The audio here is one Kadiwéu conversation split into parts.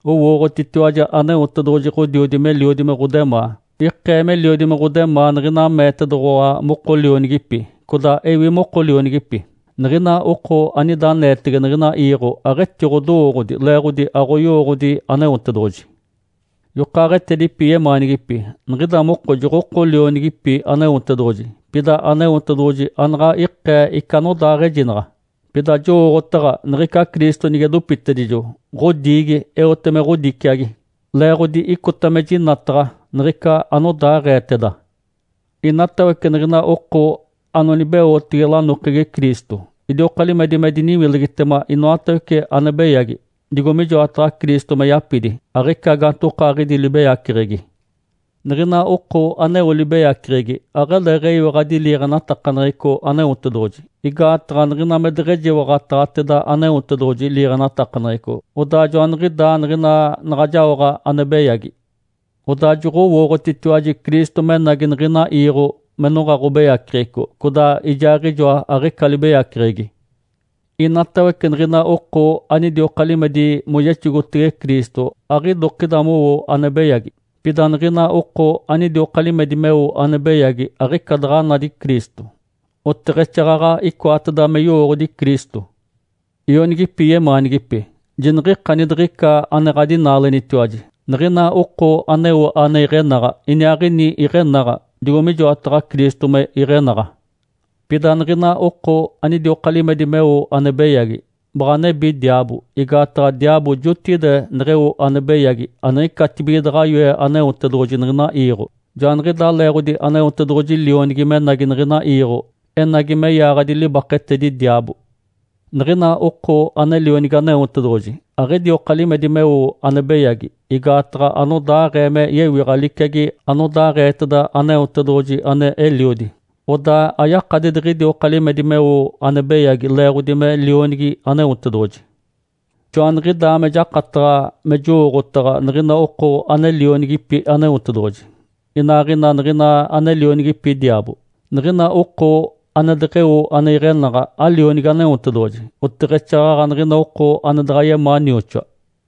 Owootiwaji Aneotedoɡ̶oji Ǥodiodi meliodi me ɡ̶odemaa. Ikee meliodi me ɡ̶odemaa niɡ̶ina meetedoɡ̶owa moko lionigipi, codaa ewi moko lionigipi. Niɡ̶ina oko anida aneetege niɡ̶ina iiɡ̶o aɡ̶etiɡ̶odowooɡ̶odi, leeɡ̶odi aɡ̶oyowooɡ̶odi Aneotedoɡ̶oji. Yokaaɡ̶etedipi yemaanigipi. Niɡ̶ida moko joɡ̶oko lionigipi Aneotedoɡ̶oji. Pida Aneotedoɡ̶oji anaɡ̶a ikee ica anodaaɡ̶ejinaɡ̶a, pida jowooɡ̶otaɡ̶a niɡ̶ica Cristo nige dopitedijo, ɡ̶odiigi, eote me ɡ̶odiciagi, leeɡ̶odi icota me jinataɡ̶a niɡ̶ica anodaaɡ̶eeteda. Inatawece niɡ̶ina oko anonibeotege lanokegi Cristo idioka limedi me diniwilegitema inoatawece ane beyagi, digo mijoataɡ̶a Cristo me yapidi, aɡ̶ica gaantokaaɡ̶idi libeyaceɡ̶egi. Niɡ̶ina oko aneo libeyaceɡ̶egi aɡ̶aleeɡ̶eyiwaɡ̶adi liiɡ̶enatakaneɡ̶eco Aneotedoɡ̶oji. Igaataɡ̶a niɡ̶ina me deɡ̶ejiwaɡ̶ataɡ̶ateda Aneotedoɡ̶oji liiɡ̶enatakaneɡ̶eco, odaa joaniɡ̶idaa niɡ̶ina naɡ̶a jaoɡ̶a ane beyagi. Odaa joɡ̶owooɡ̶otitiwaji Cristo menagi niɡ̶ina iiɡ̶o me noɡ̶a ɡ̶obeyaceɡ̶eco, codaa Ijaaɡ̶ijoa aɡ̶ica libeyaceɡ̶egi. Inatawece niɡ̶ina oko anidioka limedi moyexogotege Cristo aɡ̶idokida mowo ane beyagi. Pida niɡ̶ina oko anidioka limedi meo ane beyagi aɡ̶ica daɡ̶a nadi Cristo, oteɡ̶exaaɡ̶aɡ̶a icoateda me yowooɡ̶odi Cristo. Ionigipi yemaanigipi. Jiniɡ̶ikani diɡ̶ica ane ɡ̶adinaalenitiwaji. Niɡ̶ina oko aneo ane iɡ̶enaɡ̶a, iniaaɡ̶ini iɡ̶enaɡ̶a, digo mijoataɡ̶a Cristo me iɡ̶enaɡ̶a. Pida niɡ̶ina oko anidioka limedi meo ane beyagi, baɡ̶a nebi diaabo, igaataɡ̶a diaabo jotigide neɡ̶eo ane beyagi aniɡ̶icatibige daɡ̶a yoe Aneotedoɡ̶oji niɡ̶ina iiɡ̶o. Joaniɡ̶idaa leeɡ̶odi Aneotedoɡ̶oji Lionigi menagi niɡ̶ina iiɡ̶o, enagi me yaaɡ̶adi libaketedi diaabo. Niɡ̶ina oko ane lionigi Aneotedoɡ̶oji aɡ̶idioka limedi meo ane beyagi, igaataɡ̶a anodaaɡ̶ee me yewiɡ̶a liciagi anodaaɡ̶eeteda Aneotedoɡ̶oji ane Eliodi. Odaa ayakadi diɡ̶idioka limedi meo ane beyagi leeɡ̶odi me lionigi Aneotedoɡ̶oji. Joaniɡ̶idaa me jakataɡ̶a me jowooɡ̶otaɡ̶a niɡ̶ina oko ane lionigipi Aneotedoɡ̶oji, inaaɡ̶ina niɡ̶ina ane lionigipi diaabo; niɡ̶ina oko ane deɡ̶eo ane iɡ̶enaɡ̶a alionigi Aneotedoɡ̶oji, oteɡ̶exaaɡ̶aɡ̶a niɡ̶ina oko ane daɡ̶a yemaa nioxoa.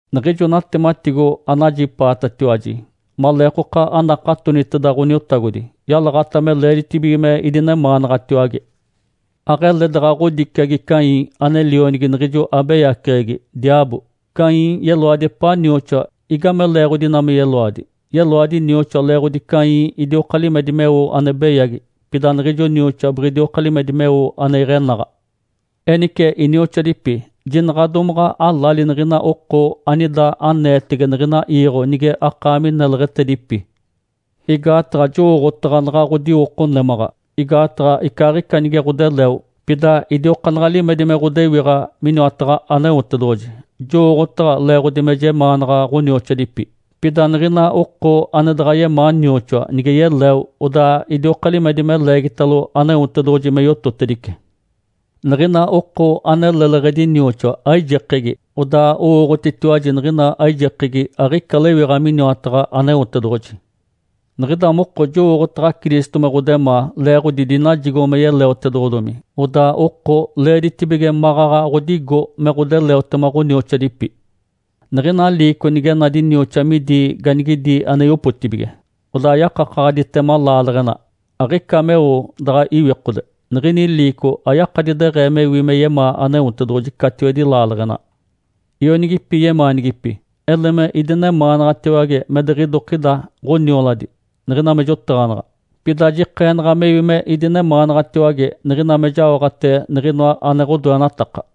Niɡ̶ijo natematigo anajipaatatiwaji maleekoka anakatoniteda Ǥoniotagodi yalaɡ̶ata me leeditibige me idinemaanaɡ̶atiwage. Aɡ̶ele daɡ̶a ɡ̶odiciagi Caim ane lionigi niɡ̶ijo abeyaceɡ̶egi, diaabo. Caim yeloadi epaa nioxoa. Igame leeɡ̶odi ina me yeloadi? Yeloadi nioxoa leeɡ̶odi Caim idioka limedi meo ane beyagi, pida niɡ̶ijo nioxoa biɡ̶idioka limedi meo ane iɡ̶enaɡ̶a. Enice inioxoadipi, jinaɡ̶a domaɡ̶a alali niɡ̶ina oko anida aneetege niɡ̶ina iiɡ̶o nige akaami neleɡ̶etedipi. Igaataɡ̶a jowooɡ̶otaɡ̶a naɡ̶a ɡ̶odiwoko némaɡ̶a, igaataɡ̶a icaaɡ̶ica nige ɡ̶odeleo, pida idiokaanaɡ̶a limedi me ɡ̶odewiɡ̶a miniwataɡ̶a Aneotedoɡ̶oji, jowooɡ̶otaɡ̶a leeɡ̶odi me jemaanaɡ̶a ɡ̶onioxoadipi. Pida niɡ̶ina oko ane daɡ̶a yemaa nioxoa nige yeleo, odaa idioka limedi me leegitalo Aneotedoɡ̶oji me yototedice. Niɡ̶ina oko ane leleɡ̶edi nioxoa, aijekegi. Odaa owooɡ̶otitiwaji niɡ̶ina aijekegi aɡ̶ica lewiɡ̶a miniwataɡ̶a Aneotedoɡ̶oji. Niɡ̶ida moko jowooɡ̶otaɡ̶a Cristo me ɡ̶odemaa, leeɡ̶odi dinajigo me yeleotedoɡ̶odomi. Odaa oko leeditibige maɡ̶aɡ̶a ɡ̶odigo me ɡ̶odeleotema ɡ̶onioxoadipi. Niɡ̶ina liico nige nadi nioxoa midi ganigidi ane yopotibige, odaa yakakaɡ̶aditema laaleɡ̶ena, aɡ̶ica meo daɡ̶a iwikode, niɡ̶ini liico ayakadi deɡ̶ee mewi me yemaa Aneotedoɡ̶oji catiwedi laaleɡ̶ena. Ionigipi yemaanigipi. Ele me idinemaanaɡ̶atiwage me diɡ̶idokida ɡ̶onioladi, niɡ̶ina me jotaɡ̶anaɡ̶a. Pida jikeenaɡ̶a mewi me idinemaanaɡ̶atiwage niɡ̶ina me jaoɡ̶ate niɡ̶inoa ane ɡ̶odoenataka.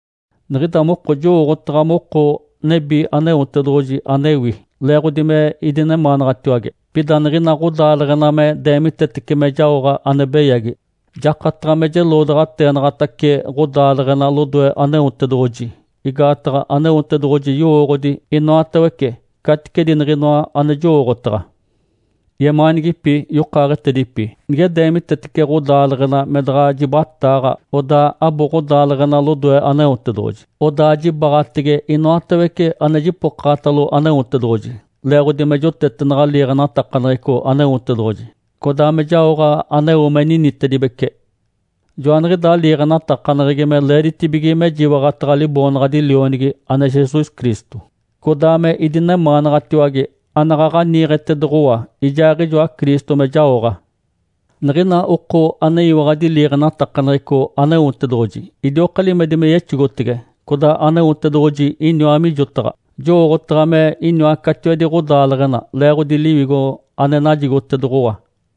Niɡ̶ida moko jowooɡ̶otaɡ̶a moko nebi Aneotedoɡ̶oji anewi, leeɡ̶odi me idinemaanaɡ̶atiwage. Pida niɡ̶ina ɡ̶odaaleɡ̶ena me deemitetece me jaoɡ̶a ane beyagi, jakataɡ̶a me jeloodaɡ̶ateenaɡ̶atace ɡ̶odaaleɡ̶ena lodoe Aneotedoɡ̶oji, igaataɡ̶a Aneotedoɡ̶oji yowooɡ̶odi inoatawece caticedi niɡ̶inoa ane jowooɡ̶otaɡ̶a. Yemaanigipi yokaaɡ̶etedipi. Nige deemitetece ɡ̶odaaleɡ̶ena me daɡ̶a jibataaɡ̶a, odaa abo ɡ̶odaaleɡ̶ena lodoe Aneotedoɡ̶oji, Odaa jibaɡ̶atege inoatawece ane jipokaɡ̶atalo Aneotedoɡ̶oji, leeɡ̶odi me jotetenaɡ̶a liiɡ̶enatakaneɡ̶eco Aneotedoɡ̶oji, codaa me jaoɡ̶a aneo me ninitedibece. Joaniɡ̶idaa liiɡ̶enatakaneɡ̶egi, me leeditibige mejiwaɡ̶ataɡ̶a Liboonaɡ̶adi Lionigi, ane Jesus Cristo, codaa me idinemaanaɡ̶atiwage, anaɡ̶aɡ̶a niiɡ̶etedoɡ̶owa ijaaɡ̶ijoa Cristo me jaoɡ̶a. Niɡ̶ina oko aneyiwaɡ̶adi liiɡ̶enatakaneɡ̶eco Aneotedoɡ̶oji idioka limedi me yexogotege, codaa Aneotedoɡ̶oji iniwa mijotaɡ̶a. Jowooɡ̶otaɡ̶a me iniwa catiwedi ɡ̶odaaleɡ̶ena leeɡ̶odi Liwigo ane najigotedoɡ̶owa.